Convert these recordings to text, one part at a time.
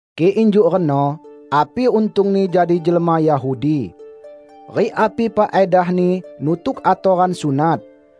Kik injuk reno, api untungni jadi jelma Yahudi? Rik api faedahni nutuk atoran sunat?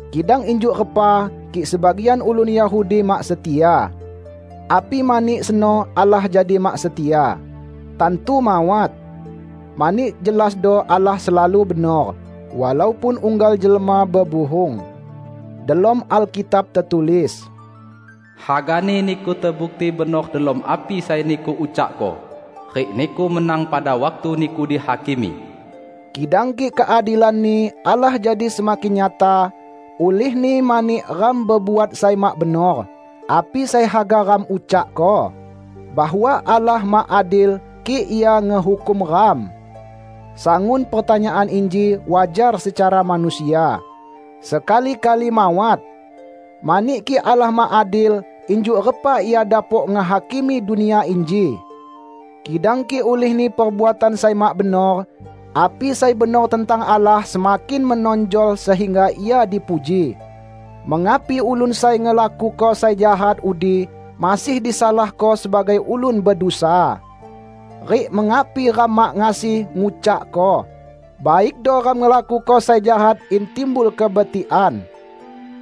Kidang injuk repa kik sebagian ulun Yahudi mak setia? Api mani seno Allah jadi mak setia. Tantu mawat! Mani jelasdo Allah selalu benor, walaupun unggal jelma bebuhung. Delom Alkitab tetulis, "Hagani niku tebukti benor delom api sai niku ucakko, rik niku menang pada waktu niku dihakimi." Kidang kik keadilan-Ni Allah jadi semakin nyata, ulihni mani ram bebuat sai mak benor, api sai haga ram ucakko? Bahwa Allah mak adil kik Ia ngehukum ram? (Sangun pertanyaan inji wajar secara manusia.) Sekali-kali mawat! Mani kik Allah mak adil, injuk repa Ia dapok ngehakimi dunia inji? Kidang kik ulihni perbuatan sai mak benor, api sai benor tentang Allah semakin menonjol sehingga Ia dipuji, mengapi ulun sai ngelakuko sai jahat udi masih disalahko sebagai ulun bedusa? Rik mengapi ram mak ngasi ngucakko, "Baikdo ram ngelakuko sai jahat in timbul kebetikan?"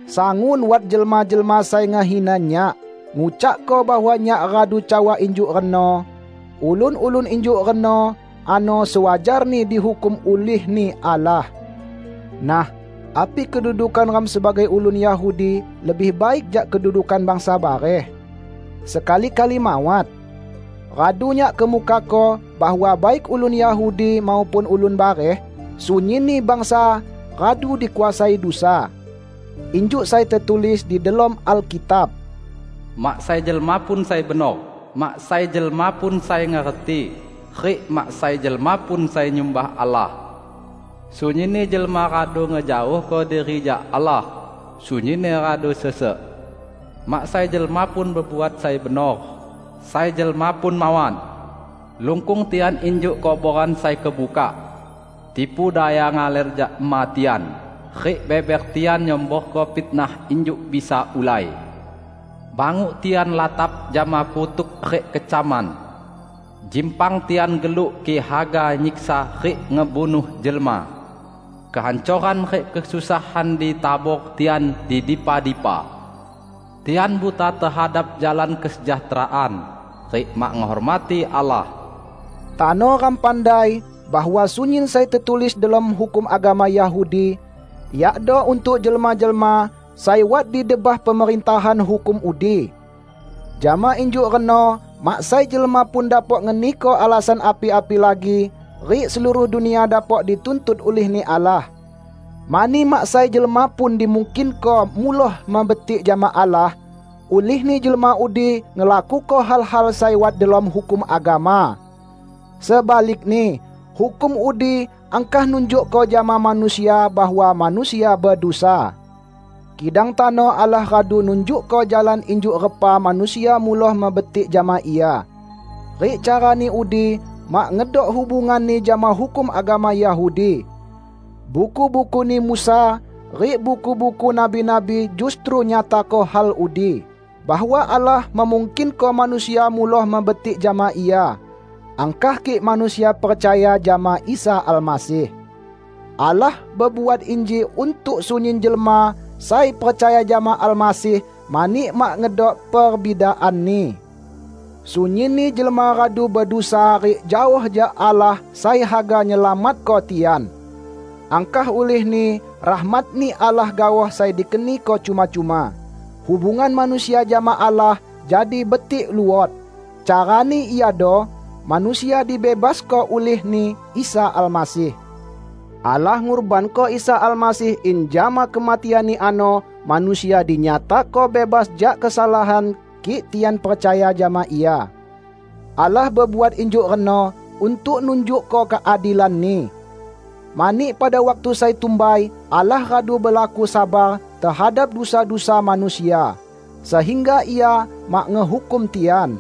Sangun wat jelma-jelma sai ngehina nyak, ngucakko bahwa nyak radu cawa injuk reno. Ulun-ulun injuk reno ano sewajarni dihukum ulih-Ni Allah. Nah, api kedudukan ram sebagai ulun Yahudi lebih baik jak kedudukan bangsa bareh? Sekali-kali mawat! Radu nyak kemukako bahwa baik ulun Yahudi maupun ulun bareh, sunyinni bangsa radu dikuasai dusa. Injuk sai tetulis di delom Alkitab, "Mak sai jelma pun sai benor, mak sai jelma pun sai ngerti rik mak sai jelma pun sai nyumbah Allah. Sunyinni jelma radu ngejaohko diri jak Allah; sunyinni radu sesek. Mak sai jelma pun bebuat sai benor; sai jelma pun mawat! Lungkung tian injuk kuboran sai kebukak. Tipu daya ngaler jak ema tian, rik beber tian nyemborko fitnah injuk bisa ulai. Banguk tian latap jama kutuk rik kecaman. Jimpang tian geluk kik haga nyiksa rik ngebunuh jelma. Kehancoran rik kesusahan ditabor tian di dipa-dipa. Tian buta tehadap jalan kesejahteraan, rik mak ngehormati Allah." Tano ram pandai bahwa sunyin sai tetulis delom hukum agama Yahudi, yakdo untuk jelma-jelma sai wat di debah pemerintahan hukum udi. Jama injuk reno mak sai jelma pun dapok ngeniko alasan api-api lagi rik seluruh dunia dapok dituntut ulih-Ni Allah. Mani mak sai jelma pun dimungkinko muloh mebetik jama Allah, ulihni jelma udi ngelakuko hal-hal sai wat delom hukum agama. Sebalikni hukum udi angkah nunjukko jama manusia bahwa manusia bedusa. Kidang tano Allah radu nunjukko jalan injuk repa manusia muloh mebetik jama Ia; rik carani udi mak ngedok hubunganni jama hukum agama Yahudi. Buku-bukuni Musa rik buku-buku nabi-nabi justru nyatako hal udi, bahwa Allah memungkinko manusia muloh mebetik jama Ia, angkah kik manusia percaya jama Isa Almasih. Allah bebuat inji untuk sunyin jelma sai percaya jama Almasih; mani mak ngedok perbidaanni. Sunyinni jelma radu bedusa rik jaoh jak Allah sai haga nyelamatko tian. Angkah ulihni rahmat-Ni Allah gaoh sai dikeniko cuma-cuma; hubungan manusia jama Allah jadi betik luot; carani iado: manusia dibebasko ulih-Ni Isa Almasih. Allah ngurbanko Isa Almasih in jama kematian-Ni ano manusia dinyatako bebas jak kesalahan kik tian percaya jama Ia. Allah bebuat injuk reno untuk nunjukko keadilan-Ni. Mani pada waktu sai tumbai Allah radu belaku sabar tehadap dusa-dusa manusia, sehingga Ia mak ngehukum tian.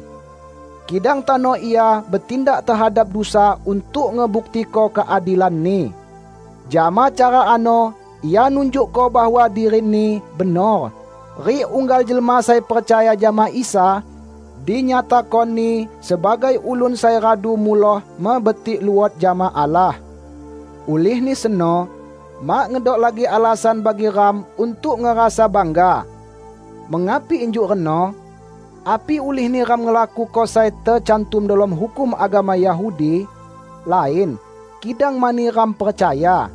Kidang tano Ia betindak tehadap dusa untuk ngebuktiko keadilan-Ni. Jama cara ano Ia nunjukko bahwa diri-Ni benor; rik unggal jelma sai percaya jama Isa, dinyatako-Ni sebagai ulun sai radu muloh mebetik luot jama Allah. Ulihni seno mak ngedok lagi alasan bagi ram untuk ngerasa bangga. Mengapi injuk reno? Api ulihni ram ngelakuko sai tecantum delom hukum agama Yahudi? Lain. Kidang mani ram percaya.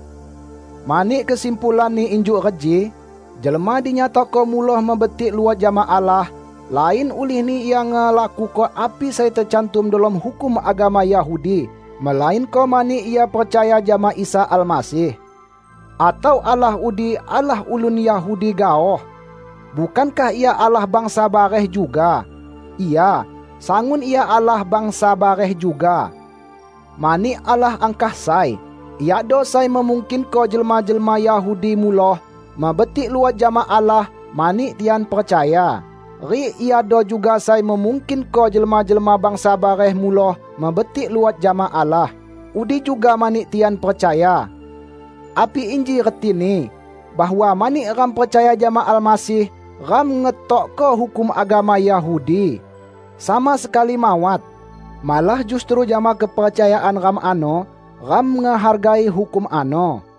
Mani kesimpulanni injuk reji: Jelma dinyatako muloh mebetik luot jama Allah, lain ulihni ia ngelakuko api sai tecantum delom hukum agama Yahudi, melainko mani ia percaya jama Isa Almasih. Atau Allah udi Allah ulun Yahudi gaoh? Bukankah Ia Allah bangsa bareh juga? Ya, sangun Ia Allah bangsa bareh juga! Mani Allah angkah sai. Iado sai memungkinko jelma-jelma Yahudi muloh mebetik luot jama Allah mani tian percaya. Rik Iado juga sai memungkinko jelma-jelma bangsa bareh muloh mebetik luot jama Allah; udi juga mani tian percaya. Api inji retini bahwa mani ram percaya jama Almasih, ram ngetokko hukum agama Yahudi? Sama sekali mawat! Malah justru jama kepercayaan ram ano, ram ngehargai hukum ano.